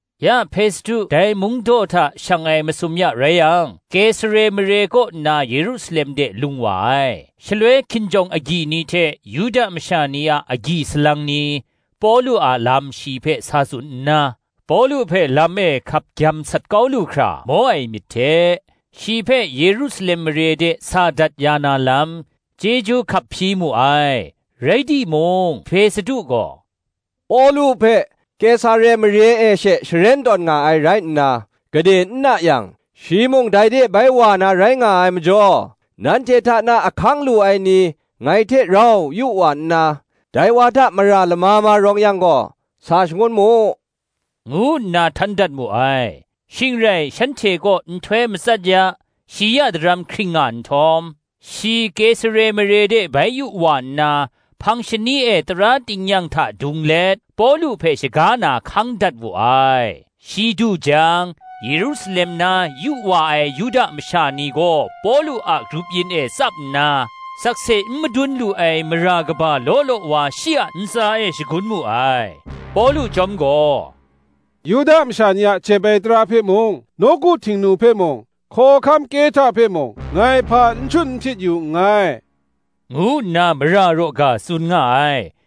Ya Hpestu dai mungdaw hta shang ai masum ya rai yang, Kesare mare kaw nna Yerusalem de lung wa ai. Shaloi hkinjawng agyi ni hte Yuda masha ni a agyi salang ni, Pawlu a lam shi hpe sa tsun nna, Pawlu hpe lam e hkap gyam sat kau lu hkra maw ai myit hte, shi hpe Yerusalem mare de sa dat ya na lam, chyeju hkap hpyi mu ai. Rai timung Hpestu gaw, Pawlu hpe Kesare mare e she sharen tawn nga ai rai nna, gade n na yang shi mung dai de bai wa na rai nga ai majaw, “Nanhte hta na ahkang lu ai ni ngai hte rau yu wa nna, dai wa hta mara lama ma rawng yang gaw, sa shagun mu,” ngu nna htan dat mu ai. Shing rai shanhte kaw nhtoi matsat ya, shi ya daram hkring nga nhtawm, shi Kesare mare de bai yu wa nna, hpang shani e tara tingnyang hta dung let, Pawlu hpe shaga na hkang dat wu ai. Shi du jang, Yerusalem na yu wa ai Yuda masha ni gaw Pawlu a grup yin e tsap nna, sakse n madun lu ai mara kaba law law wa shi a ntsa e shagun mu ai. Pawlu chyawm gaw, “Yuda masha ni a jep ai tara hpe mung, nawku Htingnu hpe mung, hkawhkam Kehta hpe mung, ngai hpa n shut n hpyit yu nngai,” ngu nna mara raw ga tsun nga ai.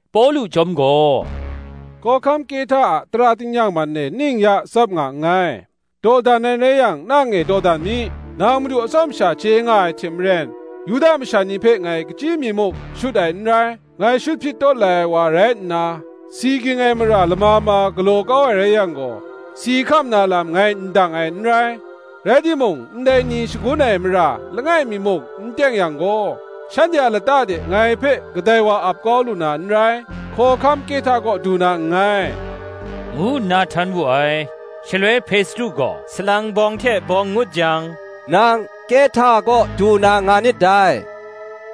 Pawlu chyawm gaw, “Hkawhkam Kehta a tara tingnyang man e ning ya tsap nga nngai; dawdan ai rai yang, nang e dawdan mi: nang madu atsawm sha chye nga ai hte maren, Yuda masha ni hpe ngai kachyi mi muk shut ai n rai. Ngai shut hpyit tawt lai ai wa rai nna, si ging ai mara lama ma galaw kau ai rai yang gaw, si hkam na lam ngai ndang ai n rai: rai timung, ndai ni shagun ai mara langai mi muk n teng yang gaw, shanhte a lata de ngai hpe kadai wa ap kau lu na n rai. Hkawhkam Kehta kaw du na nngai,” ngu nna htan wu ai. Shaloi Hpestu gaw, salang bawng hte bawng ngut jang, “Nang Kehta kaw du na nga nit dai: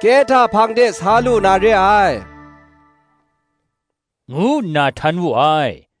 Kehta hpang de sa lu na re ai,” ngu nna htan wu ai.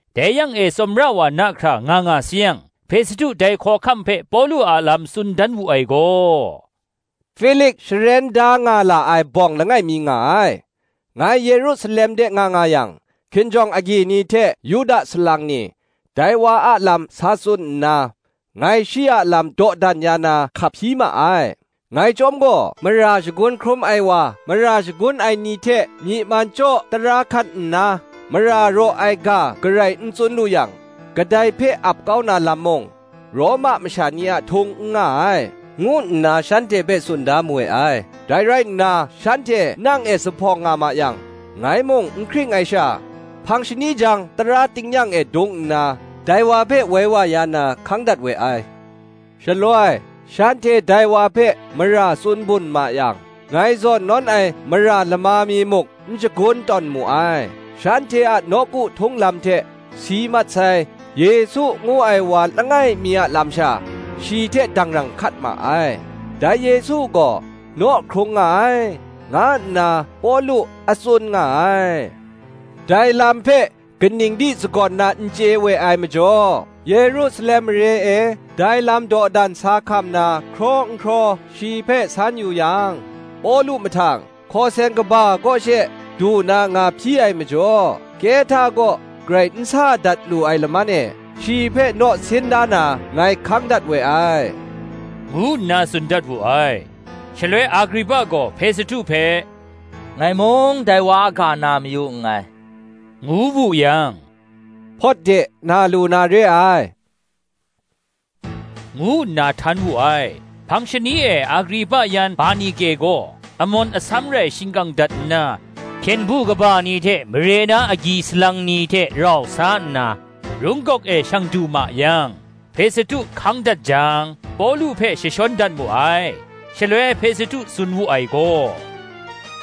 Dai yang e tsawmra wa na hkra nga nga sayang, Hpestu dai hkawhkam hpe Pawlu a lam tsun dan wu ai gaw, “Hpilik sharen da nga la ai bawng langai mi nga ai; ngai Yerusalem de nga nga yang, hkinjawng agyi ni hte Yuda salang ni, dai wa a lam sa tsun nna, ngai shi a lam dawdan ya na hkap hpyi ma ai. Ngai chyawm gaw, Mara shagun hkrum ai wa, mara shagun ai ni hte myi man chyaw dara hkat nna, mara raw ai ga garai n tsun lu yang, kadai hpe ap kau na lam mung, Roma masha ni a htung n nga ai, ngu nna shanhte hpe tsun da mawe ai. Dai rai nna shanhte nang e zuphpawng nga ma yang, ngai mung n hkring ai sha, hpang shani jang tara tingnyang e dung nna, dai wa hpe woi wa ya na hkang dat we ai. Shaloi shanhte dai wa hpe mara tsun bun ma yang, ngai zawn nawn ai mara lama mi muk n shagun tawn mu ai; shanhte a nawku htung lam hte, si mat sai, Yesu ngu ai wa langai mi a lam sha, shi hte dangrang hkat ma ai; dai Yesu gaw naw hkrung nga ai, nga nna Pawlu a tsun nga ai. Dai lam hpe kaning di sagawn na n chye we ai majaw, Yerusalem mare e dai lam dawdan sa hkam na hkraw n hkraw ai, shi hpe san yu yang, Pawlu mahtang, Hkawseng kaba kaw she du na nga hpyi ai majaw, Kehta kaw garai n sa dat lu ai laman e, shi hpe naw sin da na, ngai hkang dat we ai,” ngu nna tsun dan wu ai. Shaloi Agripa gaw Hpestu hpe, “Ngai mung dai wa a ga na mayu nngai,” ngu wu yang, “Hpawt de na lu na re ai,” ngu nna htan wu ai. Hpang shani e Agripa yan Bernike gaw, amawn asam rai shingkang dat nna, hpyen du kaba ni hte mare na agyi salang ni hte rau sa nna, rung gawk e shang du ma yang, Hpestu hkang dat jang, Pawlu hpe jashawn dat mu ai. Shaloi Hpestu tsun wu ai gaw,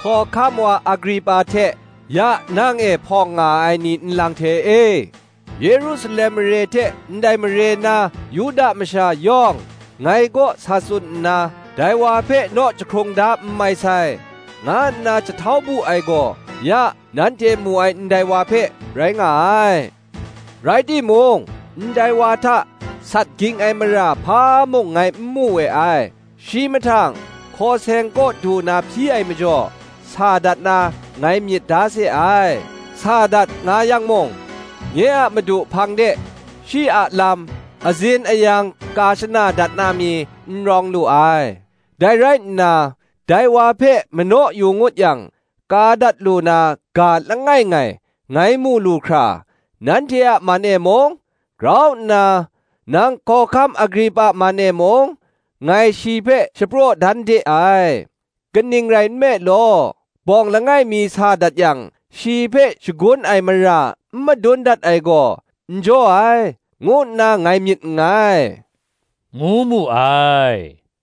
“Hkawhkam wa Agripa hte ya nang e hpawng nga ai ni nlang hte e, Yerusalem mare hte ndai mare na Yuda masha yawng, ngai kaw sa tsun nna, Dai wa hpe naw jahkrung da n mai sai, nga nna jahtau bu ai gaw, ya nanhte mu ai ndai wa hpe rai nga ai. Rai timung, ndai wa hta sat ging ai mara hpa mung ngai n mu we ai: shi mahtang, Hkawseng kaw du na hpyi ai majaw, sa dat na ngai myit da se ai. Sa dat nga yang mung, nye a Madu hpang de shi a lam azin ayang ka shana dat na mi, n rawng lu ai. Dai rai nna, dai wa hpe manaw yu ngut yang, ka dat lu na ga langai ngai ngai mu lu hkra, nanhte a man e mung, grau nna nang hkawhkam Agripa man e mung, ngai shi hpe shapraw dan de ai. Kaning rai nme law, bawng langai mi sa dat yang, shi hpe shagun ai mara n madun dat ai gaw, n jaw ai, ngu nna ngai myit nngai,” ngu mu ai.